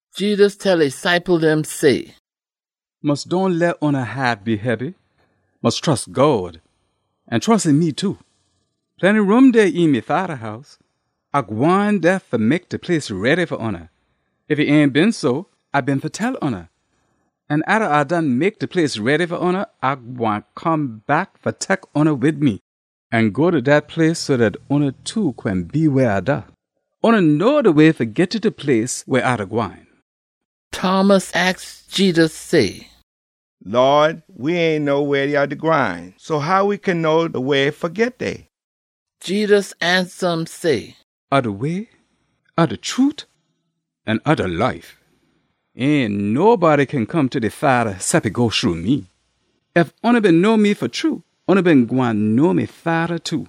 Jedus tell e ciple dem say, “Mus dohn leh oona haat be hebby. Mus trus God, an trus een me too. Plenty room dey een me Fada house. A gwine dey fa mek de place ready fa oona. Ef e ain been so, A been fa tell oona. An atta A done mek de place ready fa oona, A gwine come back fa tek oona wid me an go ta dat place so dat oona too gwine be weh A da. Oona know de way fa git ta de place weh A da gwine.” Thomas aks Jedus say, “Lawd, we ain know weh ya da gwine, so how we kin know de way fa git dey?” Jedus ansa um say, “A de way, A de trute, an A de life. Ain nobody kin come ta de Fada cep e go shru me. Ef oona been know me fa true, oona been gwine know me Fada too.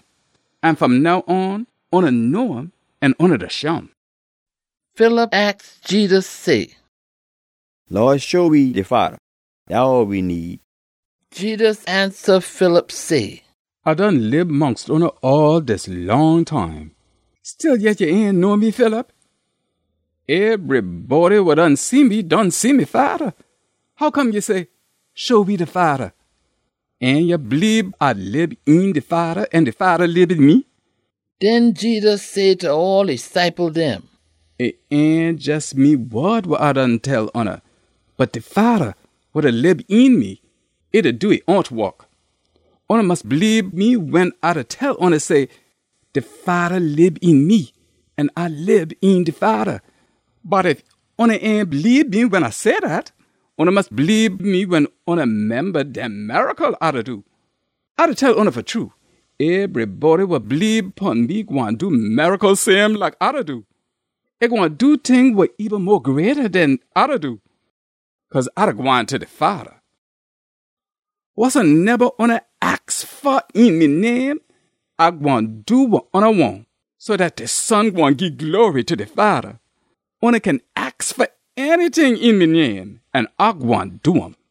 An fom now on, oona know um an oona da shim.” Philip aks Jedus say, “Lawd, show we de Fada. Dat all we need.” Jedus ansa Philip say, “A done lib mongst oona all dis long time. Stillyet ya ain know me, Philip? Ebrybody wa done see me done see me Fada. Hoccome ya say, ‘Show we de Fada’? Ain ya bleebe A lib een de Fada an de Fada lib een me?” Den Jedus say ta all e ciple dem, “E ain jes me wod wa A done tell oona, bot de Fada, wa da lib een me, e da do e own wok. Oona mus bleebe me wen A da tell oona say, de Fada lib een me an A lib een de Fada. Bot ef oona ain bleebe me wen A say dat, oona mus bleebe me wen oona memba dem miracle A da do. A da tell oona fa true, ebrybody wa bleebe pon me gwine do miracle same like A da do. E gwine do ting wa eben mo greata den A da do, cause A da gwine ta de Fada. Wasoneba oona aks fa een me name, A gwine do wa oona wahn, so dat de Son gwine gii glory ta de Fada. Oona kin aks fa anyting een me name an A gwine do um.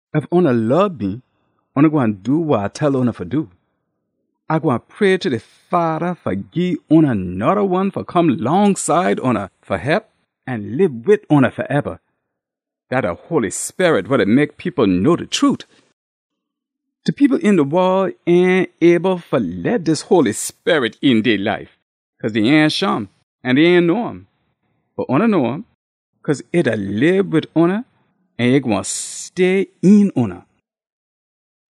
“Ef oona lob me, oona gwine do wa A tell oona fa do. A gwine pray ta de Fada fa gii oona noda one fa come longside oona fa hep an lib wid oona faeba. Dat de Holy Sperit wa da mek people know de trute. De people een de wol ain able fa leh dis Holy Sperit een dey life, cause dey ain shim an dey ain know um. Bot oona know um, cause e da lib wid oona an e gwine stay een oona.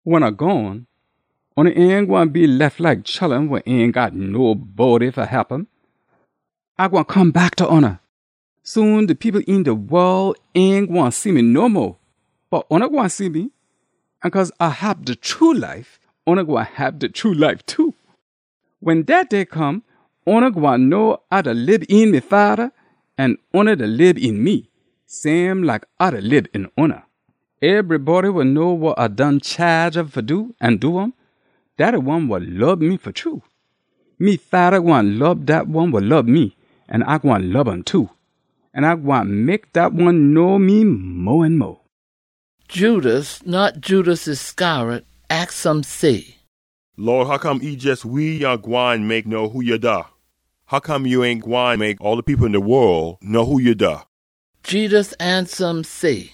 “Wen A gone, oona ain gwine be lef like chullun wa ain got nobody fa hep um. A gwine come back ta oona. Soon, de people een de wol ain gwine see me no mo, bot oona gwine see me. An cause A hab de true life, oona gwine hab de true life too. Wen dat day come, oona gwine know A da lib een me Fada an oona da lib een me, same like A da lib een oona. “Ebrybody wa know wa A done chaage um fa do an do um, dat de one wa lob me fa true. Me Fada gwine lob dat one wa lob me, an A gwine lob um too. An A gwine mek dat one know me mo an mo.” Judas (not Judas Iscariot) aks um say, “Lawd, hoccome e jes we ya gwine mek know who ya da? Hoccome ya ain gwine mek all de people een de wol know who ya da?” Jedus ansa um say,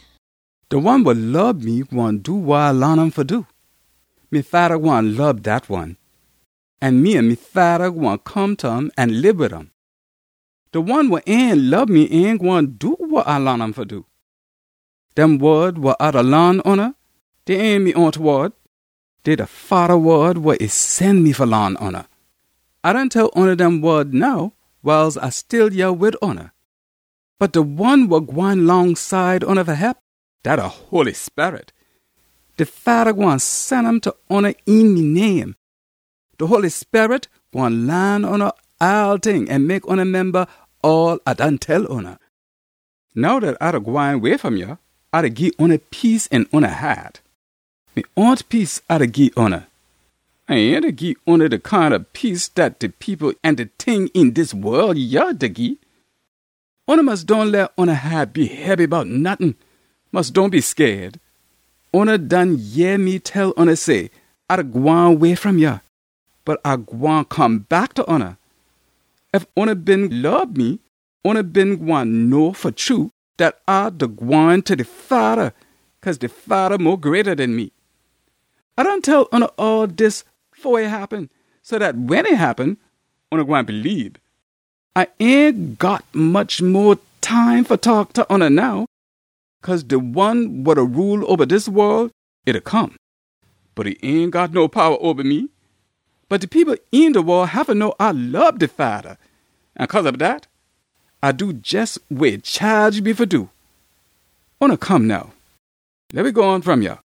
“De one wa lob me gwine do wa A laan um fa do. Me Fada gwine lob dat one. An me an me Fada gwine come ta um an lib wid um. De one wa ain lob me ain gwine do wa A laan um fa do. Dem wod wa A da laan oona, dey ain me own wod. Dey de Fada wod wa e sen me fa laan oona. “A done tell oona dem wod now wiles A still yah wid oona. Bot de One wa gwine longside oona fa hep, dat de Holy Sperit. De Fada gwine sen um ta oona een me name. De Holy Sperit gwine laan oona all ting an mek oona memba all A done tell oona. “Now dat A da gwine way fom yah, A da gii oona peace een oona haat. Me own peace A da gii oona. A ain da gii oona de kind ob peace dat de people an de ting een dis wol yah da gii. Oona mus dohn leh oona haat be hebby bout nottin. Mus dohn be scaid. Oona done yeh me tell oona say, ‘A da gwine way fom yah, bot A gwine come back ta oona.’ Ef oona been lob me, oona been gwine know fa true dat A da gwine ta de Fada, cause de Fada mo greata den me. A done tell oona all dis fo e happen, so dat wen e happen, oona gwine bleebe. A ain got much mo time fa taak ta oona now, cause de one wa da rule oba dis wol, e da come. Bot e ain got no powa oba me. Bot de people een de wol haffa know A lob de Fada, an cause ob dat, A do jes wa e chaage me fa do. “Oona come now, leh we gone fom yah.